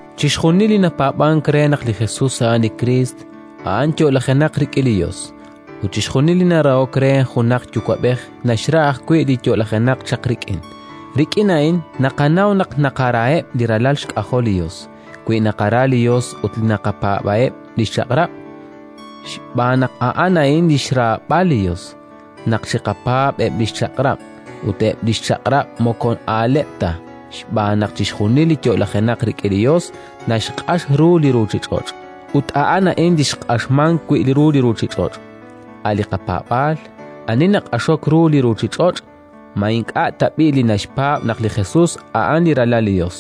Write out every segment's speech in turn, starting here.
Chixjunil li napaab'ank re naq li Jesus a'an li Kriist, a'an yo'lajenaq rik'in li Yos; ut chixjunil li narahok re junaq yuwa'b'ej naxra ajwi' li yo'lajenaq chaq rik'in. Rik'in a'in naqanaw naq naqaraheb' li ralal xk'ajol li Yos: wi naqara li Yos ut naqapaab'eb' li xchaq'rab'. Xb'aan naq a'an a'in li xraab'al li Yos: naq chiqapaab' eb' li xchaq'rab'. Ut eb' li xchaq'rab' moko aaleb' ta, xb'aan naq chixjunil li yo'lajenaq rik'in li Yos naxq'ax ru li ruuchich'och'. Ut a'an a'in li xq'axmank wi' ru li ruuchich'och': a' li qapaab'aal. Ani naq'axok ru li ruuchich'och'? Ma ink'a' tab'i' li naxpaab' naq li Jesus a'an li Ralal li Yos?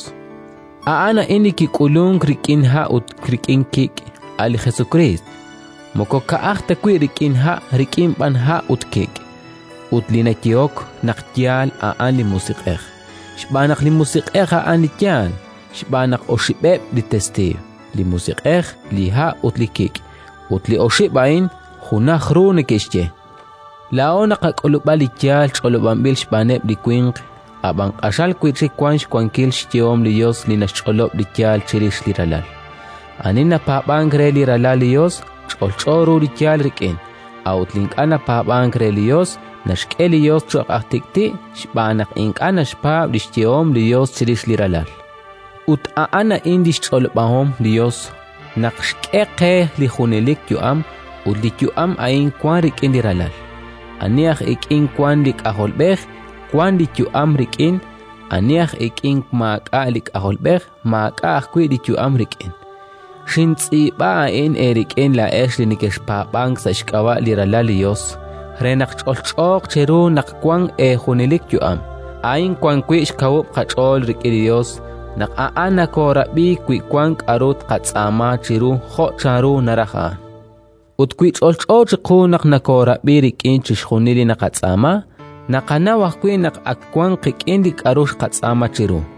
A'an a'in li kik'ulunk rik'in ha' ut rik'in kik': a' li Jesukriist. Moko ka'aj ta wi' rik'in ha', rik'in b'an ha' ut kik'. Ut li nayehok naq yaal, a'an li Musiq'ej, xb'aan naq li Musiq'ej a'an li yaal. Xb'aan naq oxib'eb' li testiiw: li Musiq'ej, li ha' ut li kik', ut li oxib' a'in junaj ru neke'xye. Laa'o naqak'ulub'a li yaal ch'olob'anb'il xb'aaneb' li winq, ab'an q'axal wi' chik wank xwankil li xyehom li Yos li naxch'olob' li yaal chirix li Ralal. Ani napaab'ank re li Ralal li Yos, ch'olch'o ru li yaal rik'in; a'ut li ink'a' napaab'ank re li Yos, naxk'e li Yos cho'q aj tik'ti', xb'aan naq ink'a' naxpaab' li xyehom li Yos chirix li Ralal. Ut a'an a'in li xch'olob'ahom li Yos: naq xk'e qe li junelik yu'am ut li yu'am a'in wank rik'in li Ralal. Ani aj ik'in wank li K'ajolb'ej, wank li yu'am rik'in; ani aj ik'in maak'a' li K'ajolb'ej, maak'a' ajwi' li yu'am rik'in. Xintz'iib'a a'in eerik'in laa'ex li nekexpaab'ank sa' xk'ab'a' li Ralal li Yos, re naq ch'olch'ooq cheru naq wank eejunelik yu'am. A'in wan wi' xkawub' qach'ool rik'in li Yos: naq A'an nokoorab'i wi wank k'aru tqatz'aama chiru jo' chanru naraj A'an. Ut wi ch'olch'o chiqu naq nokoorab'i rik'in chixjunil li tqatz'aama, naqanaw ajwi' naq ak wank qik'in li k'aru xqatz'aama chiru.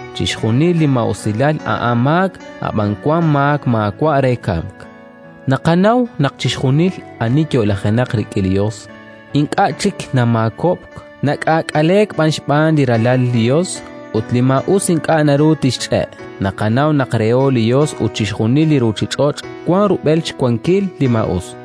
Chixjunil li maa'usilal a'an maak, ab'an wank maak maawa' re kamk. Naqanaw naq chixjunil ani yo'lajenaq rik'in li Yos, ink'a' chik namaakob'k, nak'aak'aleek b'an xb'aan li Ralal li Yos, ut li maa'us ink'a' naru tixch'e'. Naqanaw naq reho li Yos ut chixjunil li ruuchich'och' wank rub'el xwankil li maa'us.